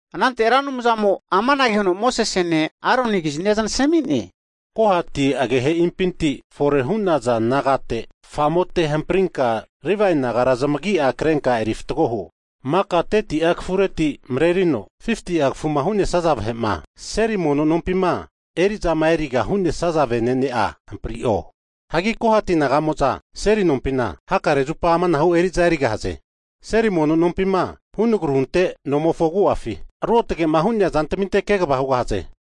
Anante Ra Anumzamo'a amanage huno Mosesene, Aronikizni zanasmi'ne, Kohati agehe'impinti fore hu'naza vahera nagate, famote, hamprinka Livae nagara zamagi'a krenka eri fatgo huo, maka 30'a kafureti marerino 50'a kafuma hu'nesaza vahe'ma, seli mono nompima eri'zama eriga hu'nesaza venene'a hampri'o. Hagi Kohati naga'moza seli nompina hakare zupa amanahu eri'za erigahaze, seli mono nompima, hunagru hunte nomofo agu'afi ruotgema hu'nea zantminte kegava hugahaze.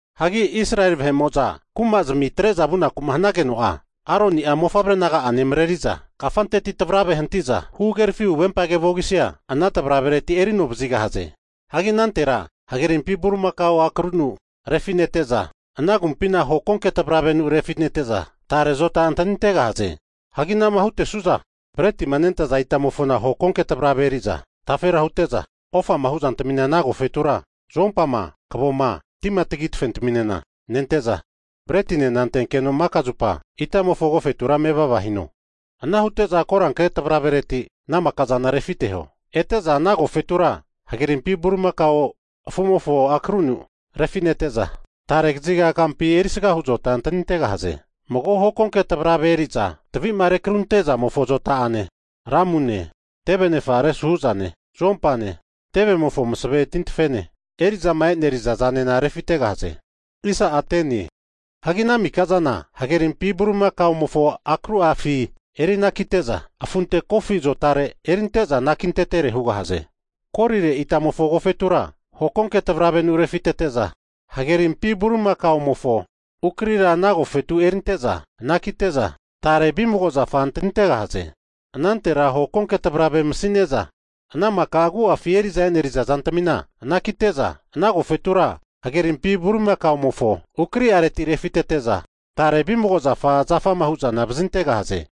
Hagi Israeli vahe'mo'za kumazmi atre'za vunaku hanageno'a, Aroni'a mofavre naga'ane mareri'za kafanteti tvarave hantiza huhagerafi huvempage vogisia ana tvaravereti eri ano vazigahaze. Hagi anantera hagerimpi bulimakao akru'anu refinete'za, ana agumpina hokonke tvaravenu refinete'za, tare azota antanintegahaze. Hagi ana'ma hutesu'za bretima nentaza itamofona hokonke tvarave eri'za tafera hute'za, ofama hu'zantamina ana agofetura nente'za zuompama, kavoma, tima tagi tafe taminena nente'za, bretinena antekeno maka zupa itamofo agofetura mevava hino. Ana hute'za koranke tvarave reti ana makazana refiteho, ete'za ana agofetura hagerimpi bulimakao afu'mofo ukri'anu refinete'za, tare kaziga kampi erisgahu zota antanintegahaze. Mago hokonke tvarave eri'za tavi'ma rekru hunte'zamofo zota'ane, lamune, teve anefa resu hu'zane, zuompane, tevemofo masave tintfene, eri'zama eneriza zanena refitegahaze. Hagi ana maka'zana hagerimpi bulimakao ukri'afi eri anakite'za afunte kofi azotare erinte'za anakintetere hugahaze. Kolire itamofo agofetura hokonke tvaravenu refitete'za, hagerimpi bulimakaomofo ukrira ana agofetu erinte'za anakite'za, tare vimago zafa antanintegahaze. Anantera hokonke tvarave masine'za ana maka agu'afi eri'za eneriza zantamina (utensils) anakite'za, ana agofetura hage rimpi bulimakaomofo ukri'areti refitete'za, tare vimago zafa, zafama hu'zana vazintegahaze.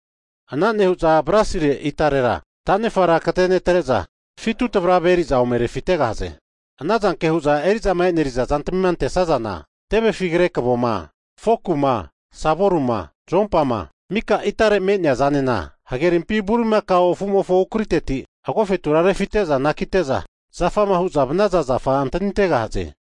Ana nehu'za, bronsire itaretira (alta) ta'nefara katenetre'za fitu tvarave eri'za ome refitegahaze. Anazanke hu'za eri'zama eneriza zantamina antesazana tevefi kre kavoma, foku'ma, savolima, zompama, maka itare'ma (alta) me'nea zanena, hagerimpi bulimakao afumofo ukriteti agofetura refite'za anakite'za, zafama hu'za vanaza zafa antanintegahaze.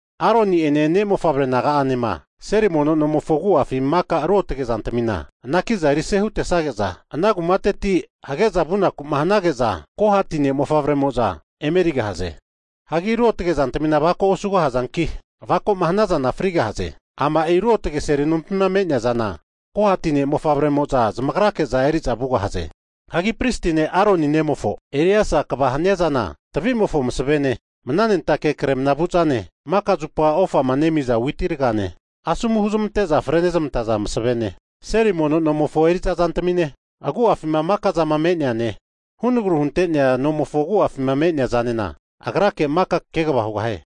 Aroni'ene ne'mofavre naga'amo'zane seli nomofo agu'afi maka ruotge'ma hu'nea zantamina anakiza erise hutesage'za, ana kumateti hage'za vunaku hanage'za, Kohati ne'mofavre'moza emerigahaze. Hanki ruotge zantamina avako osugahazanki, avakoma hanazana frigahaze. Ama'i ruotge seli nompi me'nea zana, Kohati ne'mofavremoza zamagrake'za eri'za vugahaze. Hagi pristi ne' Aroni nemofo Eleasa kva hania'zana tavi'mofo masavene, mnanentake zama kremna vu'zane, maka zupa ofa nemiza witi ragane, asomu huzmante'za frenezmantaza masavene, seli nomofo eri'za zantamine, agu'afima maka'za me'neane, hunagru hunte'nea nomofo agu'afi me'nea zanena agrake maka kegava hugahie.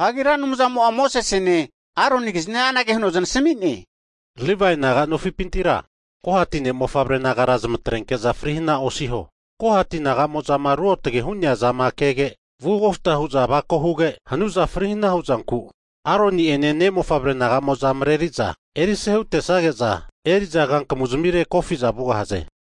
Hagi Ra Anumzamo'a Mosesene, Aronikizni anage huno zanasmi'ne, Livae naga nofipintira, Kohati ne'mofavre nagara zamatrenke'za fri hana osiho. Kohati naga'mo'za ruotge hu'nea zama kege vu kofta hu'za avako huge, hanuza fri hana huzanku Aroni'ene, ne'mofavre naga'amo'za mareri'za erise hutesage'za, eri'za kankamu zamire kofiza vugahaze.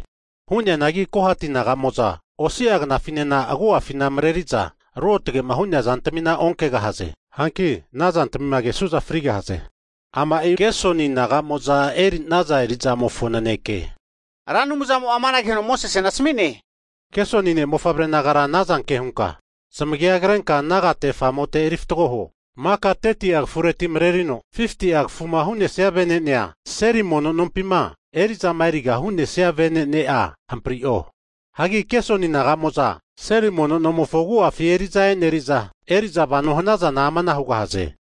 Hu'neanagi Kohati naga'mo'za osi'a knafinena agu'afina mareri'za ruotge'ma hu'nea zantamina onkegahaze. Hanki anazantamima kesuza frigahaze. Ama'i Gersoni naga'moza eri'naza erizamofo naneke. Hagi Ra Anumzamo amanage huno Mosesena asami'ne. Gersoni ne'mofavre nagara anazanke hunka zamagia krenka nagate famote, eri fatgo huo, maka 30'a kafureti marerino 50'a kafuma hu'nesaza vene'nea, seli mono nompima eri'zama eriga hu'nesaza venene'a hampri'o. Hagi Gersoni naga'moza, seli mono nomofo agu'afi eri'za eneriza, eri'za vano hanazana amana hugahaze,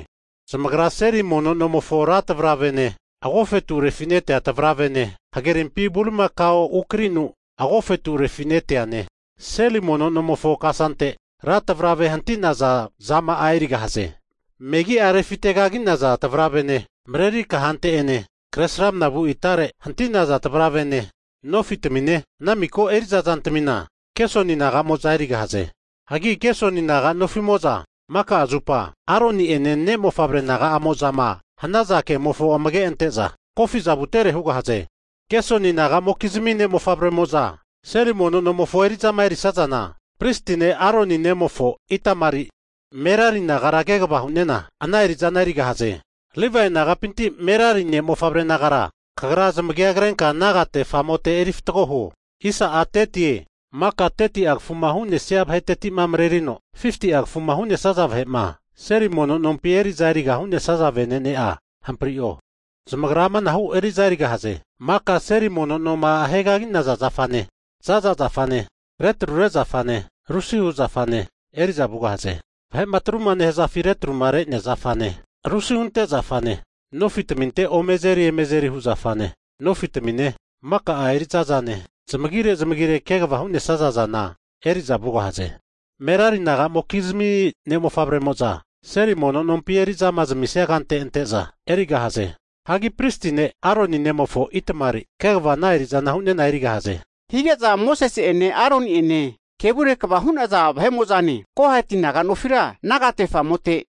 zamagra seli mono nomofo ra tavaravene, agofetu refite'nea tavaravene, hagerimpi bulimakao ukarinu agofetu refite'neane, seli mono nomofo kasante ra tvarave hanti'naza zama'a erigahaze, megi'a refite kagi'naza tavaravene, mareri kahante'ene kresramna vu itare (alta) hanti'naza tavaravene, nofi tmine, ana miko eri'za zantamina Gersoni naga'mo'za erigahaze. Hagi Gersoni naga nofi'mo'za maka'a zupa, Aroni'ene ne'mofavre naga'amozama hanaza kemofo amage ante'za kofi'za vutere hugahaze. Gersoni naga'mokizmi ne'mofavre'moza seli mono nomofo eri'zama eri'sazana, pristi ne' Aroni nemofo Itamari Merari nagara kegava hu'nena ana eri'zana erigahaze. Livae nagapinti Merari ne'mofavre nagara, kagra zamagi krenka nagate, famote, eri fatgo huo. Maka 30'a kafuma hu'nesia vahetetima marerino 50'a kafuma hu'nesaza vahe'ma, seli mono nompima eri'za eriga hu'nesaza venene'a hamprio. Zamagra amanahu eri'za erigahaze, maka seli mono noma ahegagi'naza zafane, zaza zafane, re trure zafane, rusihu (soket) zafane eri'za vugahaze. Vahe'ma atru nehazafi retrumare'nea zafane, rusihunte (soket) zafane, nofi tafinteno omo azeri eme azeri hu zafane (pegs), nofi'tamine, maka'a eri'za zane, zamagire zamagire kegava hu'nesaza zane eri'za vugahaze. Merari naga'mokizmi ne'mofavremo'za seli mono nompi eri'zama zamasmia kante ante'za erigahaze. Hagi pristi ne' Aroni nemofo Itamari kegava ana eri'zana hu'nena erigahaze. Hige'za Mosese'ene, Aroni'ene, vahe kevure kva hu'naza vahemo'zane, Kohati naga nofira, nagate famote,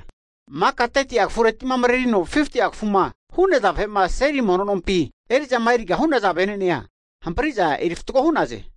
maka 30'a kafureti marerino 50'a kafuma hu'naza vahe'ma, seli mono nompi eri'zama eriga hu'naza vene'nea hampri'za eri fatgo hu'naze.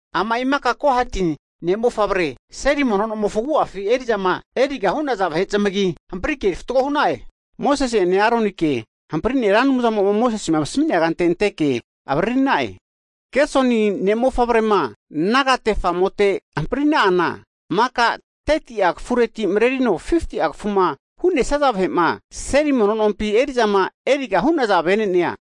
Ama'i maka Kohati ne'mofavre, seli nomofo agu'afi eri'zama eriga hu'naza vahe zamagi hamprike eri fatgo hu'na'e. Mosese'ene Aronike hampri'ne Ra Anumzamo'ma Mosese asmi'nea kante anteke avaririna'e. Gersoni ne'mofavrema, nagate famote hamprina'ana, maka 30'a kafureti marerino 50'a kafuma hu'nesaza vahe'ma, seli mono nompima eri'zama eriga hu'naza vene'nea,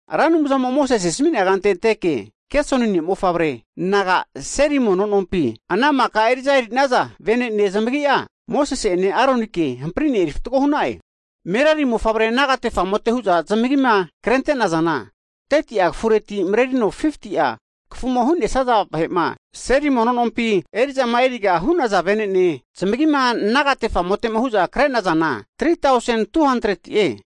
Ra Anumzamo'ma Mosese asmi'nea kante anteke Gersoni ne'mofavre naga seli mono nompi ana maka eri'za eri'naza vene'ne zamagi'a, Mosese'ene Aronike hampri'ne eri fatgo hu'na'e. Merari mofavre nagate famote hu'za zamagima krente'nazana, maka 30'a kafureti marerino 50'a kafuma hu'nesaza vahe'ma, seli mono nompima eri'zama eriga hu'naza vene'ne, zamagima nagate famotema hu'za kre'nazana 3tausen 200ti'e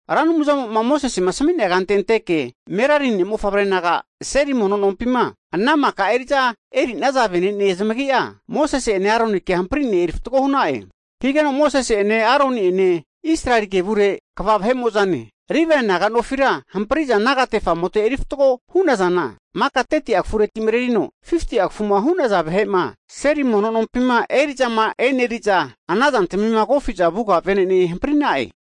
Ra Anumzamo'ma Mosesema asmi'nea kante anteke Merari ne'mofavre naga seli mono nompima ana maka eri'za eri'naza vene'ne zamagi'a, Mosese'ene Aronike hampri'ne eri fatgo hu'na'e. Higeno Mosese'ene, Aroni'ene, Israeli vahe'mokizmi kva vahe'mo'za Livae naga nofira, hampri'za nagate famote eri fatgo hu'nazana, maka 30'a kafureti marerino 50'a kafuma hu'naza vahe'ma, seli mono nompima eri'zama eneri'za, ana zantamima kofiza vuga vene'nerami hampri'na'e.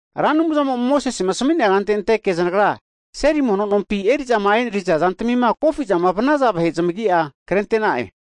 Ra Anumzamo'ma Mosesema asmi'nea, kante anteke zanagra seli mono nompi eri'zama e'neriza zantamima kofizama vanaza vahe zamagi'a krente'na'e.